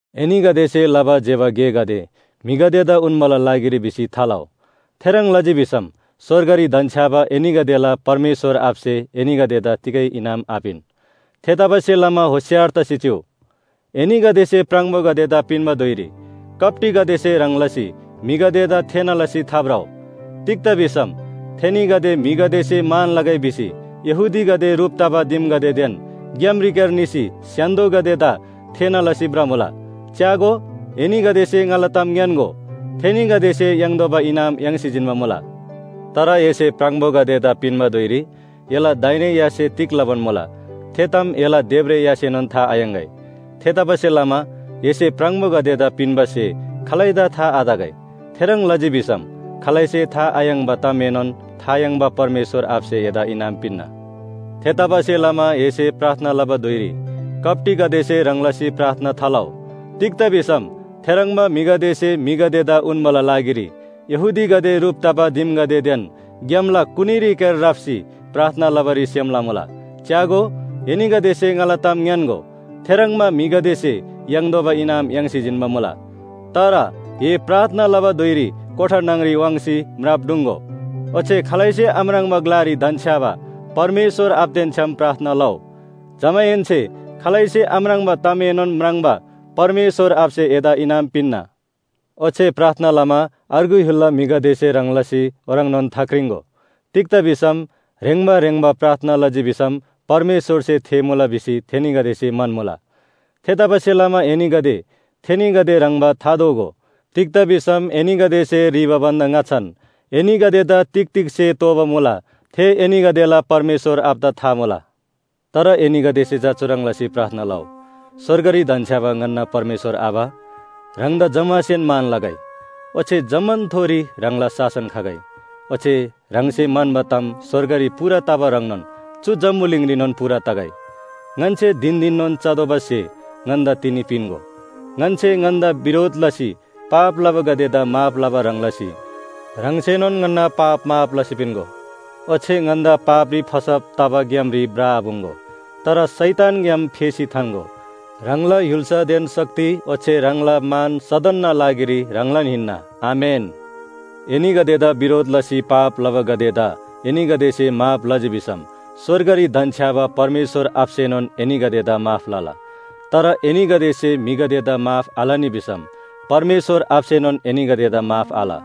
“एनीगदेसे लबा ज्‍यबा गेगदे म्‍हिगदेदा उन्‍बाला लागिरी भिसी थालउ। थेह्रङ् लजी भिसम स्‍वर्गरी धन्‍छ्‌याबा एनीगदेला परमेश्‍वर आबासे एनीगदेदा तिगै इनाम आपिन। थेतबासेलमा होशियार तसी चिउ। “एनीगदेसे प्राङबोगदेदा पिन्‍बा धुइरी कप्‍टीगदेसे ह्रङ् लसी म्‍हिगदेदा थेःना लसी थाभ्रउ। तिग्‍दा भिसम थेनीगदे म्‍हिगदेसे मान लगै भिसी यहूदीगदे ह्रुप तबा दिमगदेदेन ग्‍यामरीक्‍यार निसी स्‍य्‍हान्‍दोदा थेःना लसी भ्रमुला। च्‍यागो, एनीगदेसे ङाला ताम ङ्‌यान्‍गो, थेनीगदेसे याङ्तोःबा इनाम याङ्सी जिन्‍बा मुला। तर एसे प्राङबोगदेदा पिन्‍बा धुइरी एला दाहिने यासे तिग लबान मुला थे ताम एला देब्रे यासेनोन था थायाङ्‍गै। थेतबासेलमा एसे प्राङबोगदेदा पिन्‍बा स्‍हे खालैदा था आतगै। थेह्रङ् लजी भिसम खालैसे था आयाङ्बा तामएनोन था याङ्बा परमेश्‍वर आबासे एदा इनाम पिन्‍ना। “थेतबासेलमा एसे प्रार्थना लबा धुइरी कप्‍टीगदेसे ह्रङ् लसी थालउ। तिग्‍दा भिसम थेह्रङ्बा म्‍हिगदेसे म्‍हिगदेदा उन्‍बाला लागिरी यहूदीगदे ह्रुप तबा दिमगदेदेन ग्‍यामला कुनीरीक्‍यार राप्‍सी प्रार्थना लबारी सेम लमुला। च्‍यागो, एनीगदेसे ङाला ताम ङ्‌यान्‍गो, थेह्रङ्बा म्‍हिगदेसे याङ्तोःबा इनाम याङ्सी जिन्‍बा मुला। तर ए प्रार्थना लबा धुइरी कोठा न्‍हङरी वाङ्सी म्राप ढुङ्‍गो, ओच्‍छे खालैसे आम्राङ्बा ग्‍लारी धन्‍छ्‌याबा परमेश्‍वर आबादेन छ्‌याम प्रार्थना लउ। जमाहेन्‍से खालैसे आम्राङ्बा तामएनोन म्राङ्बा परमेश्‍वर आबासे एदा इनाम पिन्‍ना। ओच्‍छे प्रार्थना लमा अर्गु य्‍हुलला म्‍हिगदेसे ह्रङ् लसी ओह्रङ्नोन थाक्रिङ्‍गो। तिग्‍दा भिसम ह्रेङ्बा ह्रेङ्बा प्रार्थना लजी भिसम परमेश्‍वरसे थेःमुला भिसी थेनीगदेसे म्‍हन्‍मुला। थेतबासेलमा एनीगदे थेनीगदे ह्रङ्‌बा थादोगो। तिग्‍दा भिसम एनीगदेसे ह्रीबा भन्‍दा ङाच्‍छान एनीगदेदा तिग तिग स्‍हे तोःबा मुला, थे एनीगदेला परमेश्‍वर आबादा था मुला। “तर एनीगदेसे चा चुह्रङ् लसी प्रार्थना लउ, ‘स्‍वर्गरी धन्‍छ्‌याबा ङन्‍ना परमेश्‍वर आबा, ह्राङदा जम्‍मासेन मान लगै। ओच्‍छे जम्‍मानथोरी ह्राङला शासन खगै, ओच्‍छे ह्राङसे म्‍हन्‍बा ताम स्‍वर्गरी पूरा तबा ह्रङ्नोन चु जम्‍बुलिङरीनोन पूरा तगै। ङन्‍से धिन धिननोन चतोःबा स्‍हे ङन्‍दा तिनी पिन्‍गो। ङन्‍से ङन्‍दा बिरोध लसी पाप लबागदेदा माफ लबा ह्रङ् लसी ह्राङसेनोन ङन्‍ना पाप माफ लसी पिन्‍गो। ओच्‍छे ङन्‍दा पापरी फसब तबा ग्‍यामरी भ्रआपुङ्‍गो, तर शैतानग्‍याम फेसी थान्‍गो। ह्राङला य्‍हुल्‍सादेन शक्ति ओच्‍छे ह्राङला मान सदनना लागिरी ह्राङलान हिन्‍ना, आमेन।’ “एनीगदेदा बिरोध लसी पाप लबागदेदा एनीगदेसे माफ लजी भिसम स्‍वर्गरी धन्‍छ्‌याबा परमेश्‍वर आबासेनोन एनीगदेदा माफ लला। तर एनीगदेसे म्‍हिगदेदा माफ आलनी भिसम परमेश्‍वर आबासेनोन एनीगदेदा माफ आल।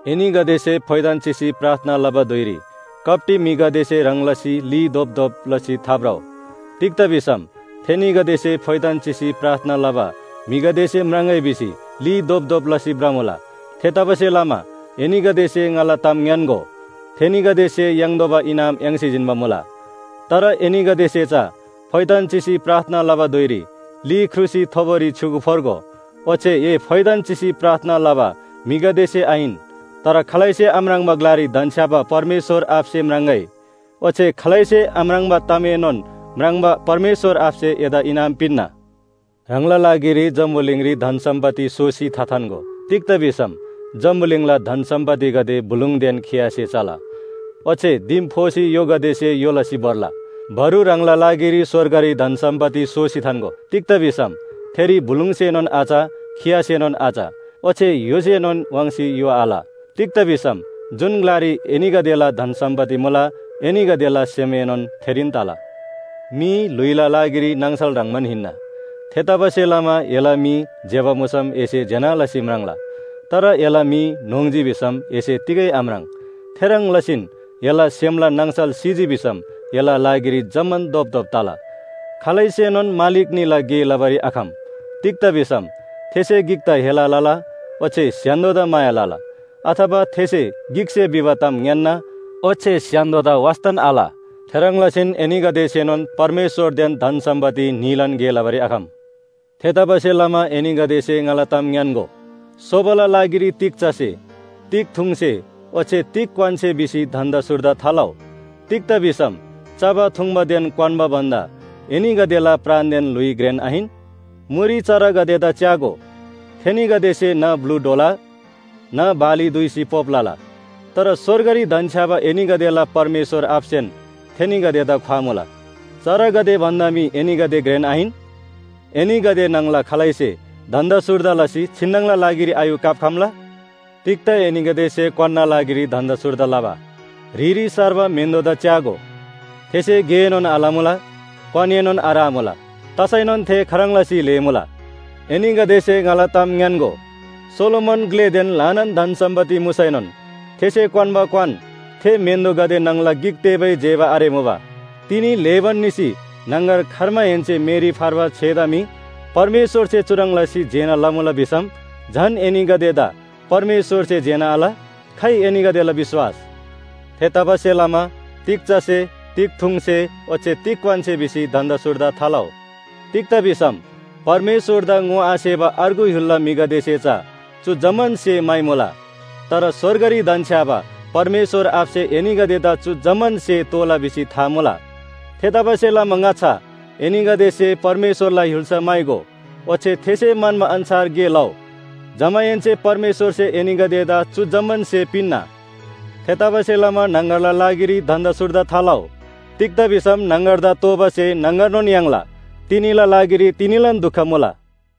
“एनीगदेसे फोइथान चिसी प्रार्थना लबा धुइरी कप्‍टी म्‍हिगदेसे ह्रङ् लसी ली धोपधोप लसी थाभ्रउ। तिग्‍दा भिसम थेनीगदेसे फोइथान चिसी प्रार्थना लबा म्‍हिगदेसे म्राङ्‍गै भिसी ली धोपधोप लसी भ्रमुला। थेतबासेलमा एनीगदेसे ङाला ताम ङ्‌यान्‍गो, थेनीगदेसे याङ्तोःबा इनाम याङ्सी जिन्‍बा मुला। तर एनीगदेसे चा फोइथान चिसी प्रार्थना लबा धुइरी ली ख्रुसी थोबोरी छ्‌युगु फोर्गो। ओच्‍छे ए फोइथान चिसी प्रार्थना लबा म्‍हिगदेसे आहिन, तर खालैसे आम्राङ्बा ग्‍लारी धन्‍छ्‌याबा परमेश्‍वर आबासे म्राङ्‍गै। ओच्‍छे खालैसे आम्राङ्बा तामएनोन म्राङ्बा परमेश्‍वर आबासे एदा इनाम पिन्‍ना। “ह्राङला लागिरी जम्‍बुलिङरी धन सम्‍पत्ति सोसी थाथान्‍गो, तिग्‍दा भिसम जम्‍बुलिङला धन सम्‍पत्तिगदे बुलुङदेन खियासे चला, ओच्‍छे दिम फोसी य्‍होगदेसे य्‍हो लसी भोर्ला। बरु ह्राङला लागिरी स्‍वर्गरी धन सम्‍पत्ति सोसी थान्‍गो। तिग्‍दा भिसम थेरी बुलुङसेएनोन आच खियासेएनोन आच, ओच्‍छे य्‍होसेएनोन वाङ्सी य्‍हो आल। तिग्‍दा भिसम जुन ग्‍लारी एनीगदेला धन सम्‍पत्ति मुला, एनीगदेला सेमएनोन थेरीन तला। “मी ल्‍हुइला लागिरी नाङसल ह्रङ्‌बान हिन्‍ना। थेतबासेलमा एला मी ज्‍यबा मुसम एसे ज्‍यना लसी म्राङ्ला, तर एला मी न्‍होङ्जी भिसम एसे तिगै आम्राङ्। थेह्रङ् लसीन एला सेमला नाङसल सिजी भिसम एला लागिरी जम्‍मान धोपधोप तला। “खालैसेनोन मालिक न्‍हीला गे लबारी आखम। तिग्‍दा भिसम थेसे गिकदा हेला लला, ओच्‍छे स्‍य्‍हान्‍दोदा माया लला। अथवा थेसे गिकसे भिबा ताम ङ्‌यान्‍ना, ओच्‍छे स्‍य्‍हान्‍दोदा वास्‍तान आल। थेह्रङ् लसीन एनीगदेसेनोन परमेश्‍वरदेन धन सम्‍पत्ति न्‍हीलान गे लबारी आखम। “थेतबासेलमा एनीगदेसे ङाला ताम ङ्‌यान्‍गो, सोबाला लागिरी तिग चसे तिग थुङ्‍से ओच्‍छे तिग क्‍वान्‍से भिसी धन्‍दा सुर्दा थालउ। तिग्‍दा भिसम चबा थुङ्बादेन क्‍वान्‍बा भन्‍दा एनीगदेला प्राणदेन ल्‍हुइ घ्रेन आहिन? मुरी चरागदेदा च्‍यागो, थेनीगदेसे न्‍ह ब्‍लु ढ्वला, न्‍ह बाली दुइसी पोप लला, तर स्‍वर्गरी धन्‍छ्‌याबा एनीगदेला परमेश्‍वर आबासेन थेनीगदेदा ख्‍वामुला। चरागदे भन्‍दा मी एनीगदे घ्रेन आहिन? एनीगदे न्‍हङला खालैसे धन्‍दा सुर्दा लसी छिन्‍नङला लागिरी आयू काप्‍खम्‍ला? “तिग्‍दा एनीगदेसे क्‍वान्‍ना लागिरी धन्‍दा सुर्दा लबा? ह्रिरी सार्बा म्‍हेन्‍दोदा च्‍यागो, थेसे गेएनोन आलमुला, क्‍वानएनोन आरामुला। तसैनोन थे खाह्रङ् लसी ल्‍हेमुला! एनीगदेसे ङाला ताम ङ्‌यान्‍गो, सोलोमन ग्‍लेदेन ल्‍हानान धन सम्‍पत्ति मुसैनोन थेसे क्‍वान्‍बा क्‍वान थे म्‍हेन्‍दोगदे न्‍हङला गिक तेबै जेबा आरेमुबा। तिनी ल्‍हेबान निसी न्‍हङगर खर्माहेन्‍से मेरी फर्बा छेदा मी परमेश्‍वरसे चुह्रङ् लसी जेना लमुला भिसम झन एनीगदेदा परमेश्‍वरसे जेना आल? खाइ एनीगदेला विश्‍वास? थेतबासेलमा ‘तिग चसे? तिग थुङ्‍से? ओच्‍छे तिग क्‍वान्‍से?’ भिसी धन्‍दा सुर्दा थालउ। तिग्‍दा भिसम परमेश्‍वरदा ङोआसेबा अर्गु य्‍हुलला म्‍हिगदेसे चा चु जम्‍मान स्‍हे म्‍हाइमुला। तर स्‍वर्गरी धन्‍छ्‌याबा परमेश्‍वर आबासे एनीगदेदा चु जम्‍मान स्‍हे तोःला भिसी था मुला। थेतबासेलमा ङाच्‍छा एनीगदेसे परमेश्‍वरला य्‍हुल्‍सा म्‍हाइगो ओच्‍छे थेसे म्‍हन्‍बा अन्‍छार गे लउ। जमाहेन्‍से परमेश्‍वरसे एनीगदेदा चु जम्‍मान स्‍हे पिन्‍ना। थेतबासेलमा न्‍हङगरला लागिरी धन्‍दा सुर्दा थालउ। तिग्‍दा भिसम न्‍हङगरदा तोःबा स्‍हे न्‍हङगरनोन याङ्ला। तिनीला लागिरी तिनीलान दुख मुला।